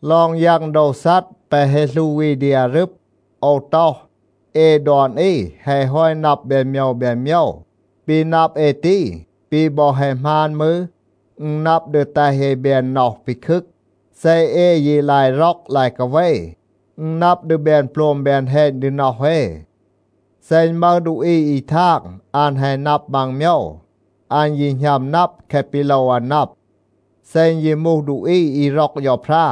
ลอง ยัง โดว ซัด แปะ แฮะ หลู อี ดี อารึบ, โอว ต็อห, เอ ดอน อี แฮะ ฮอต นับ แบน โมยว แบน โมยว. ปี นับ เอ ตี ปี บอ แฮะ หมาน มืร, อึณ นับ ดี แตห เอ แบน น็อห ปีคึก. เซ เอ ยี ลาย ร็อก ลาย กาเว, อึณ นับ ดี แบน โปลม แบน แฮณ ดี น็อห เอ. เซ อึณ มึห ดูอี อี ทาง อัน แฮะ นับ มัง โมยว, อัน ยี หณัม นับ แคะ ปี โลว อัน นับ. เซ อึณ ยี มูห ดูอี อี ร็อก เฌาพรา,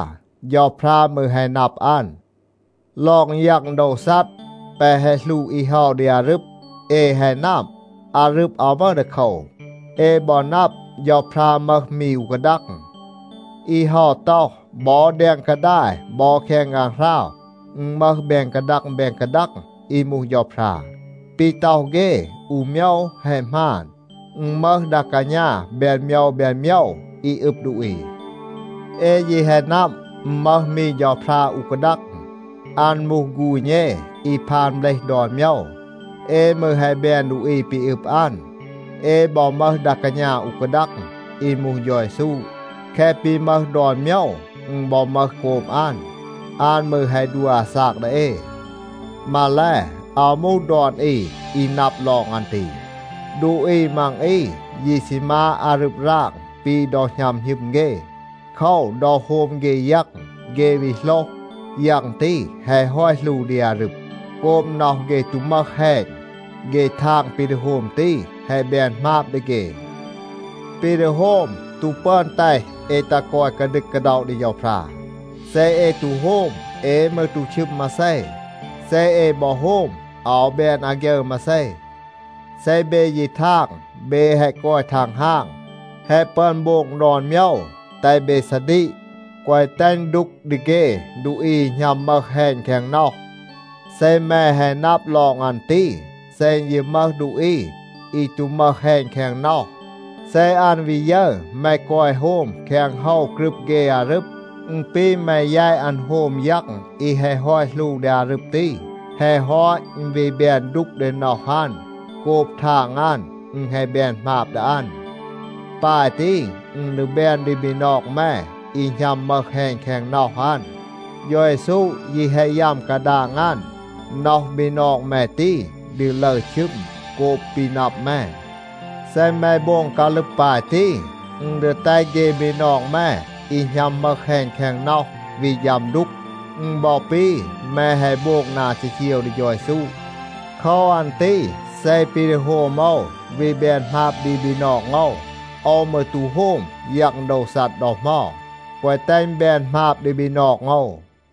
เฌาพรา มืร แฮะ นับ อัน. ลอง ยัง โดว ซัด แปะ แฮะ หลู อี เฮา ดี อารึบ, เอ แฮะ นับ, อารึบ อาว มึห ดีโคว. เอ บอ นับ, เฌาพรา มึห มี อู กาดัง. อี เฮา ต็อห, บอ แดง กาดาย บอ แคง ฆางหราว อึณ มึห แบน กาดัง แบน กาดัง อี มูห เฌาพรา. (ปี ต็อห เฆ, อู โมยว แฮะ หมาน. อึณ มึห ดา กาณา แบน โมยว แบน โมยว อี อึบ ดูอี.) เอ ยี แฮะ นับ, อึณ มึห มี เฌาพรา อู กาดัง. อัน มูห ฆูณ เอ อี พาน เบลห ดอน โมยว. เอ มืร แฮะ แบน ดูอี ปี อึบ อัน. เอ บอ มึห ดา กาณา อู กาดัง อี มูห เฌา เยซู. แคะ ปี มึห ดอน โมยว, อึณ บอ มึห โกบ อัน. อัน มืร แฮะ ดัว อาซาก ดี เอ. มาแล, อาว มูห ดอน อี อี นับ ลอง อัน ตี. ดูอี มัง อี ยี ซี มาด อารึบ ราง ปี ดอ หณัม หณึม เฆ. โคว, ดอ โฮม เฆ ยัง, เฆ วี โหลห, ยัง ตี แฮะ ฮอต หลู ดี อารึบ. โกบ น็อห เฆ ตู มึห แฮณ, เฆ ทาง ปี ดี โฮม ตี แฮะ แบน หมาบ ดี เฆ. ปี ดี โฮม ตู ปึอน แตห เอ ตัห กอย กาดึก กาด็อะ ดี เฌาพรา. เซ เอ ตู โฮม, เอ มืร ตู ชึม มาเซ. เซ เอ บอ โฮม อาว แบน อาฆยึร มาเซ. เซ เบ ยี ทาง เบ แฮะ กอย ทังฮาง, แฮะ ปึอน โบง ดอน โมยว, แตห เบ ซาดีก, แกวะ แตห อึณ ดูก ดี เฆ ดูอี อี หณัม มึห แฮณ แคง น็อห. เซ แม แฮะ นับ ลอง อัน ตี, เซ อึณ ยี มึห ดูอี อี ตู มึห แฮณ แคง น็อห, เซ อัน วี ยึร แม กอย โฮม แคง โฮว กรึบ เฆ อารึบ, อึณ ปี แม แยต อัน โฮม ยัง อี แฮะ ฮอต หลู ดี อารึบ ตี. แฮะ ฮอต, อึณ วี แบน ดูก ดี น็อห อัน โกบ ทาง อัน, อึณ แฮะ แบน หมาบ ดี อัน. ปาย ตี, อึณ ดี แบน ดี บีนอง แม อี หณัม มึห แฮณ แคง น็อห อัน. เฌา เยซู ยี แฮะ ยัม กาดาง อัน. น็อห บีนอง แม ตี ดี ลึร ชึม โกบ ปี นับ แม. เซ แม โบง กาลึบ ปาย ตี, อึณ ดี แตห เฆ บีนอง แม อี หณัม มึห แฮณ แคง น็อห วี ฌัม ดูก. อึณ บอ ปี แม แฮะ โบง นา จีจีว ดี เฌา เยซู. โคว อัน ตี เซ ปี ดี โฮม โอว วี แบน หมาบ ดี บีนอง โอว, โอว มืร ตู โฮม ยัง โดว ซัด ดอ เหมา, แกวะ แตห อึณ แบน หมาบ ดี บีนอง โอว.